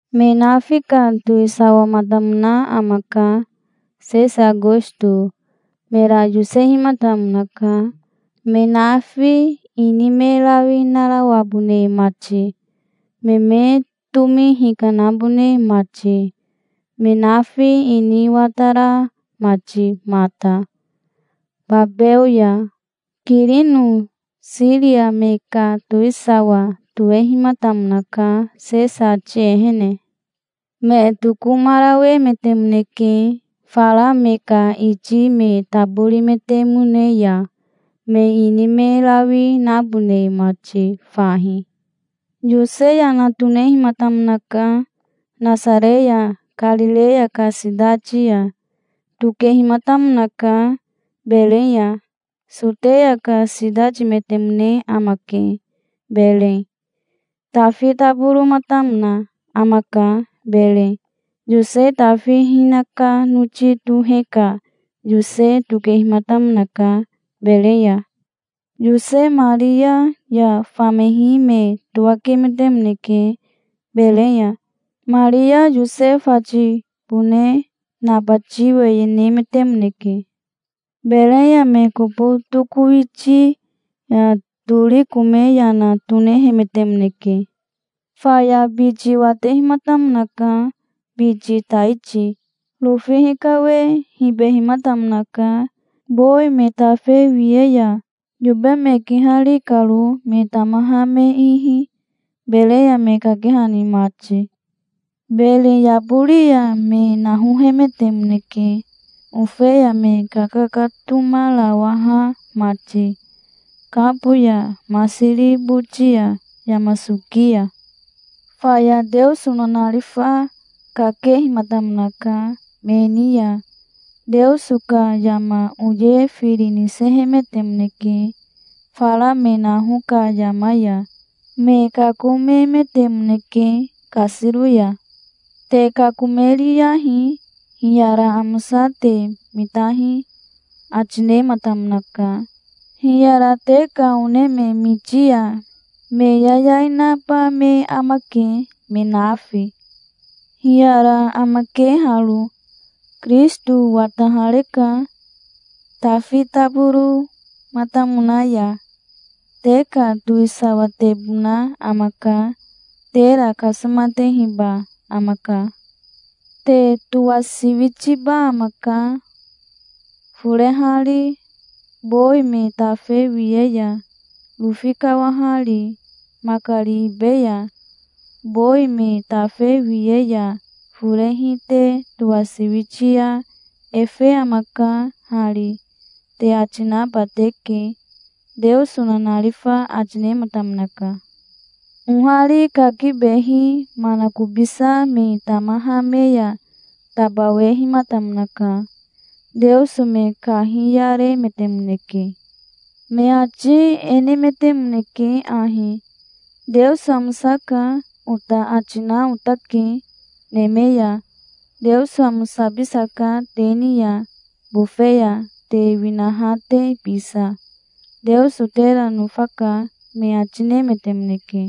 Me nafi ka towisawamatamona amaka, Sesa Akosto. Mera yosehimatamonaka, me nafi ini me rawi narawabone mati, me me tomi hikanabone mati, me nafi ini watara mati mata, babeo ya. Kirino Siria me ka towisawa tohehimatamonaka, Sesa ati ehene. Me tokomarawemetemoneke, fara me ka iti me taborimetemone ya, me ini me rawi nabone mati fahi. Yose yana tonehimatamonaka, Nasare ya Karireya ka sitati ya. Tokehimatamonaka, Berei ya. Soteya ka sitatimetemone amake, Berei. Tafi taboromatamona amaka, Berei. Yose Tafi hinaka noti tohe ka Yose tokehimatamonaka, Berei ya. Yose Maria ya famehi me towakemetemoneke, Berei ya. Maria Yose fatibone nabati weye nemetemoneke. Berei ya me kobo tokowitia tori kome yana tonehemetemoneke. Faya biti watehimatamonaka, biti taiti. Rofi hikawe hibehimatamonaka, bowi me tafe wiye ya, yobe me kihari karo, me tamaha me ihi, Berei ya me kakehani mati. Bere yabori ya me nahohemetemoneke, ofeya me kakatomarawaha mati, kabo ya, masiri boti ya, yama soki ya. Faya Teoso nanarifa kakehimatamonaka me ni ya. Teoso ka yama oye firi nisehemetemoneke, fara me naho ka yama ya. Me kakomemetemoneke kasiro ya. "Te kakomeriyahi. Hiyara amosa te mitahi", ati nematamonaka. "Hiyara te ka one me miti ya me yayai naba me amake, me nafi. Hiyara amake haro: Kirisito watahareka, Tafi taboromatamona ya. Te ka towisawatebona amaka. Tera kasomatehiba amaka. Te towasiwitiba amaka, forehari, bowi me tafe wiye ya, rofi kawahari makari ibe ya. Bowi me tafe wiye ya forehi te towasiwiti ya 'Efe amaka hari', te ati naba teke", Teoso nanarifa ati nematamonaka. Ohari kakibehi manakobisa me tamaha me ya tabawehimatamonaka. Teoso me kahiyaremetemoneke. Me ati e nemetemoneke ahi: "'Teoso amosaka', ota ati na otake, neme ya. Teoso amosabisaka te ni ya, bofe ya te winaha te bisa. Teoso tera nofaka", me ati nemetemoneke.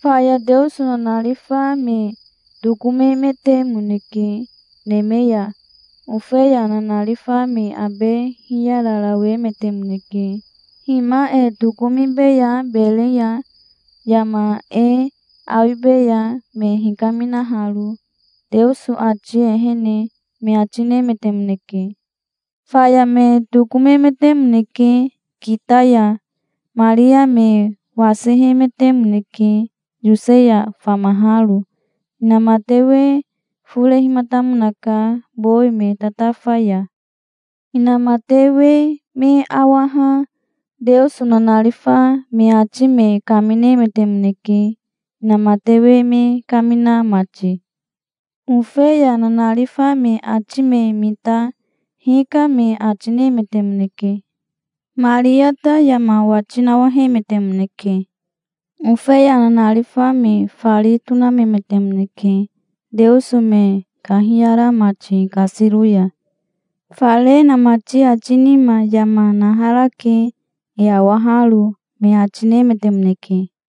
Faya Teoso nanarifa me tokomemetemoneke neme ya. Ofeya nanarifa me abe hiyararawemetemoneke. "Hima e tokomibeya Berei ya. Yama e awibeya, me hikaminaharo, Teoso ati ehene", me ati nemetemoneke. Faya me tokomemetemoneke kita ya. Maria me wasihemetemoneke Yose ya famaharo. Inamatewe forehimatamonaka bowi me tatafa ya. Inamatewe me awaha Teoso nanarifa me ati me kaminemetemoneke, inamatewe me kamina mati. Ofeya nanarifa me ati me mita "Hika", me ati nemetemoneke. Maria ta yama wati nawahemetemoneke. Ofeya nanarifa me fari tonamemetemoneke, Teoso me kahiyara mati kasiro ya. "Fare inamati ati nima yama naharake, e awaharo", me ati nemetemoneke.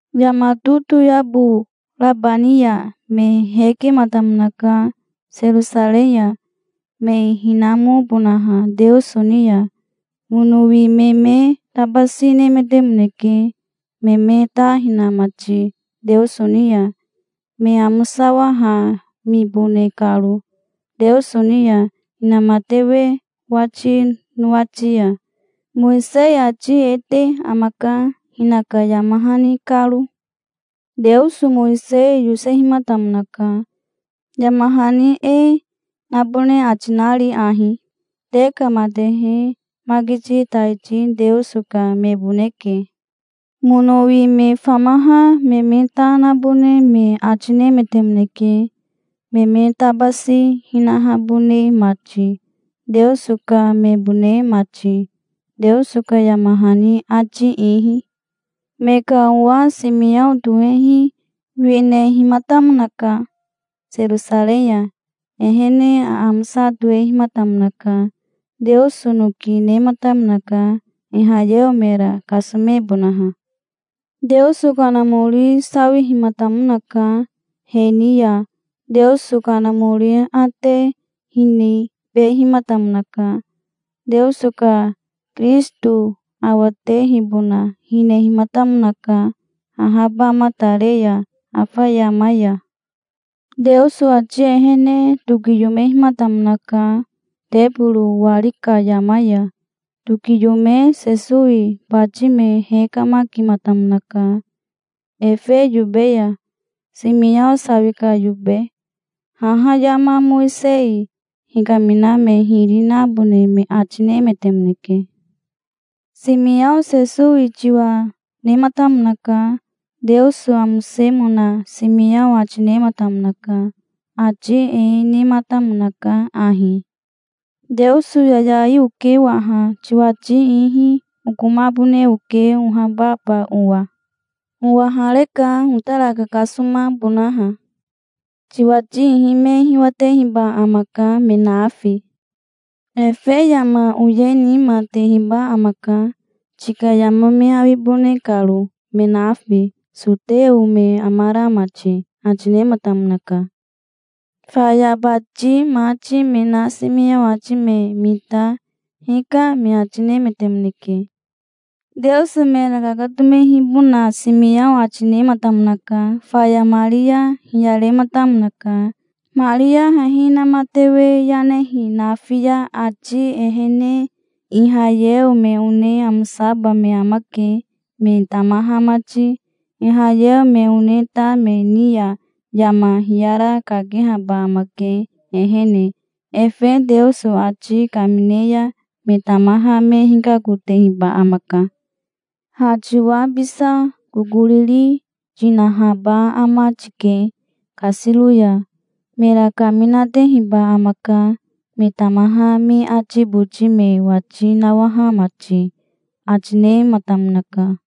Yama totoyabo raba ni ya me hekematamonaka Serosarei ya, me hinamobonaha Teoso ni ya. Monowi me me tabasi nemetemoneke, me me ta hina mati Teoso ni ya, me amosawahamibone karo Teoso ni ya, inamatewe wati nowati ya. Mowisei ati e te amaka hinaka yama hani karo. Teoso Mowisei yosehimatamonaka, yama hani e nabone ati nari ahi: "Te ka matehe makiti taiti Teoso ka meboneke". Monowi me famaha me me ta nabone me ati nemetemoneke, me me tabasi hinahabone mati, Teoso ka mebone mati, Teoso ka yama hani ati ihi. Me ka owa Simiao tohehi winehimatamonaka Serosarei ya. Ehene aamosa tohehimatamonaka. Teoso noki nematamonaka Ihayeo mera kasomebonaha. Teoso Kanamori sawihimatamonaka he ni ya. Teoso Kanamori aate hinibehimatamonaka. Teoso ka Kirisito awatehibona hinehimatamonaka, ahabamatare ya afa yama ya. Teoso ati ehene tokiyomehimatamonaka teboro wari ka yama ya. Tokiyome Sesowi bati me hekamakimatamonaka efe yobe ya, Simiao sawi ka yobe. Haha yama Mowisei hikamina me hiri nabone me ati nemetemoneke. Simiao Sesowi tiwa nematamonaka. Teoso amosemona Simiao ati nematamonaka. Ati e nematamonaka ahi: "Teoso yayai oke waha. Tiwati ihi okomabone oke ohababa owa. Owahareka, otara kakasomabonaha. Tiwati ihi me hiwatehiba amaka, me nafi. Efe yama oye nima tehiba amaka, tika yama me awibone karo, me nafi, soteo me amara mati", ati nematamonaka. Faya bati mati me na Simiao ati me mita "Hika", me ati nemetemoneke. Teoso mera kakatomehibona Simiao ati nematamonaka. Faya Maria hiyarematamonaka. "Maria hehi inamatewe yanehi nafi ya ati ehene Ihayeo me one amosaba me amake, me tamaha mati. Ihayeo me one ta me ni ya yama hiyara kakehaba amake, ehene. Efe Teoso ati kamine ya me tamaha me hikakotehiba amaka. Ha tiwa bisa kokoriri tinahaba ama tike kasiro ya. Mera kaminatehiba amaka, me tamaha me ati boti me wati nawaha mati", ati nematamonaka.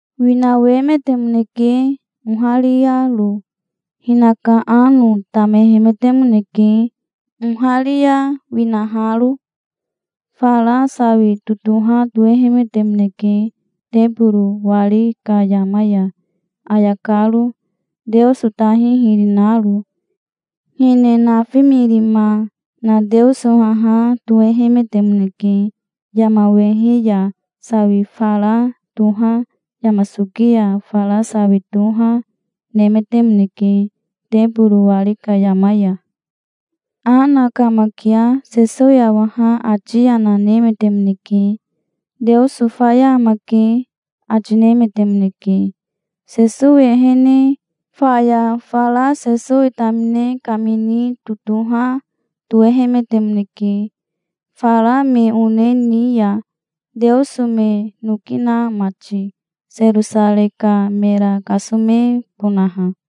Winawemetemoneke ohariaro. Hinaka ano tamehemetemoneke, oharia winaharo. Fara sawi totoha tohehemetemoneke teboro wari ka yama ya, ayakaro, Teoso tahi hiri naro. Hine nafimirima na Teoso haha tohehemetemoneke. Yama wehe ya sawi fara toha, yama soki ya fara sawi toha, nemetemoneke teboro wari ka yama ya. Ana kamakia Sesowi awaha ati yana nemetemoneke. "Teoso faya amake", ati nemetemoneke, Sesowi ehene. Faya fara Sesowi tamine kamini totoha tohehemetemoneke, fara me one ni ya, Teoso me noki na mati, Serosarei ka mera kasomebonaha.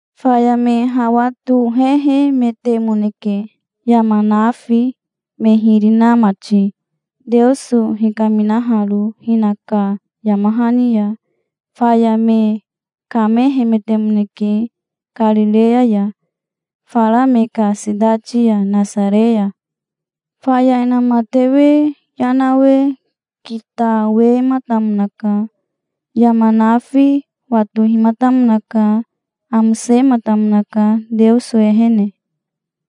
Faya me hawa tohehemetemoneke, yama nafi me hiri na mati, Teoso hikaminaharo hinaka yama hani ya. Faya me kamehemetemoneke Karireya ya, fara me ka sitati ya Nasare ya. Faya inamatewe yanawe kitawematamonaka. Yama nafi watohimatamonaka. Amosematamonaka Teoso ehene.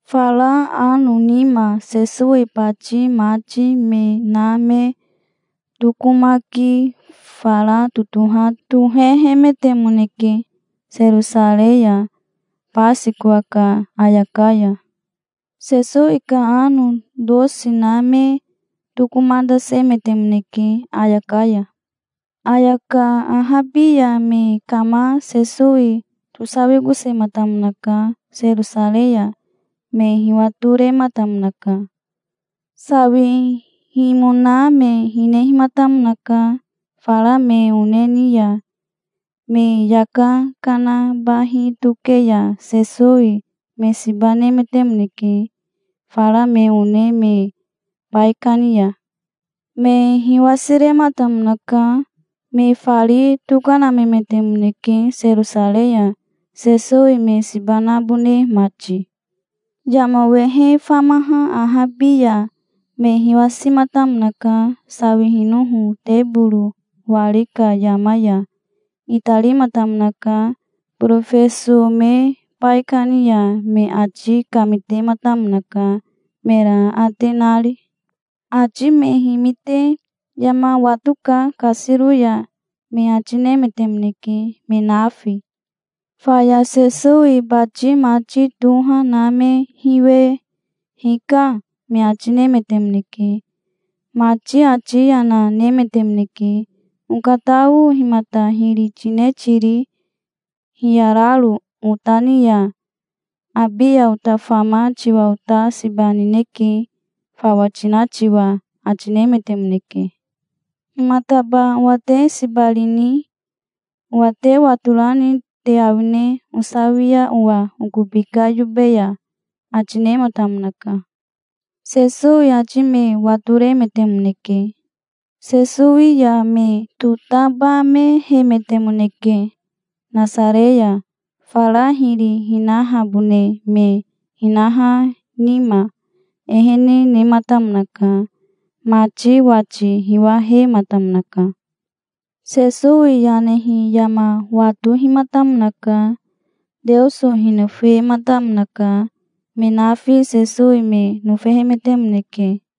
Fara ano nima Sesowi bati mati me na me tokomaki fara totoha tohehemetemoneke Serosarei ya, Basikowa ka ayaka ya. Sesowi ka ano tosi na me tokomatasemetemoneke ayaka ya. Ayaka ahabi ya me kama Sesowi tosawikosematamonaka Serosarei ya. Me hiwatorematamonaka. Sawihimona me hinehimatamonaka fara me one ni ya. Me yaka kana bahi toke ya Sesowi me siba nemetemoneke fara me one me baikani ya. Me hiwasirematamonaka. Me fari tokanamemetemoneke Serosarei ya, Sesowi me siba nabone mati. Yama wehe famaha ahabi ya me hiwasimatamonaka, sawihinoho teboro wari ka yama ya. Itarimatamonaka borofeso me baikani ya. Me ati kamitematamonaka, mera aate nari. Ati me himite "Yama watoka kasiro ya", me ati nemetemoneke, me nafi. Faya Sesowi bati mati toha na me hiwe "Hika", me ati nemetemoneke. Mati ati yana nemetemoneke. "Okatao himata hiri tine tiri hiyararo ota ni ya? Abi ya ota fama tiwa ota siba nineke, fawa tina tiwa", ati nemetemoneke. "Himataba owa te siba rini? Owa te watorani te awine, osawia owa okobi ka yobe ya?" ati nematamonaka. Sesowi ati me watoremetemoneke. Sesowi ya me totabamehemetemoneke Nasare ya. Fara hiri hinahabone me hinaha nima ehene nematamonaka. Mati wati hiwahematamonaka. Sesowi yanehi yama watohimatamonaka. Teoso hinofematamonaka. Me nafi Sesowi me nofehemetemoneke.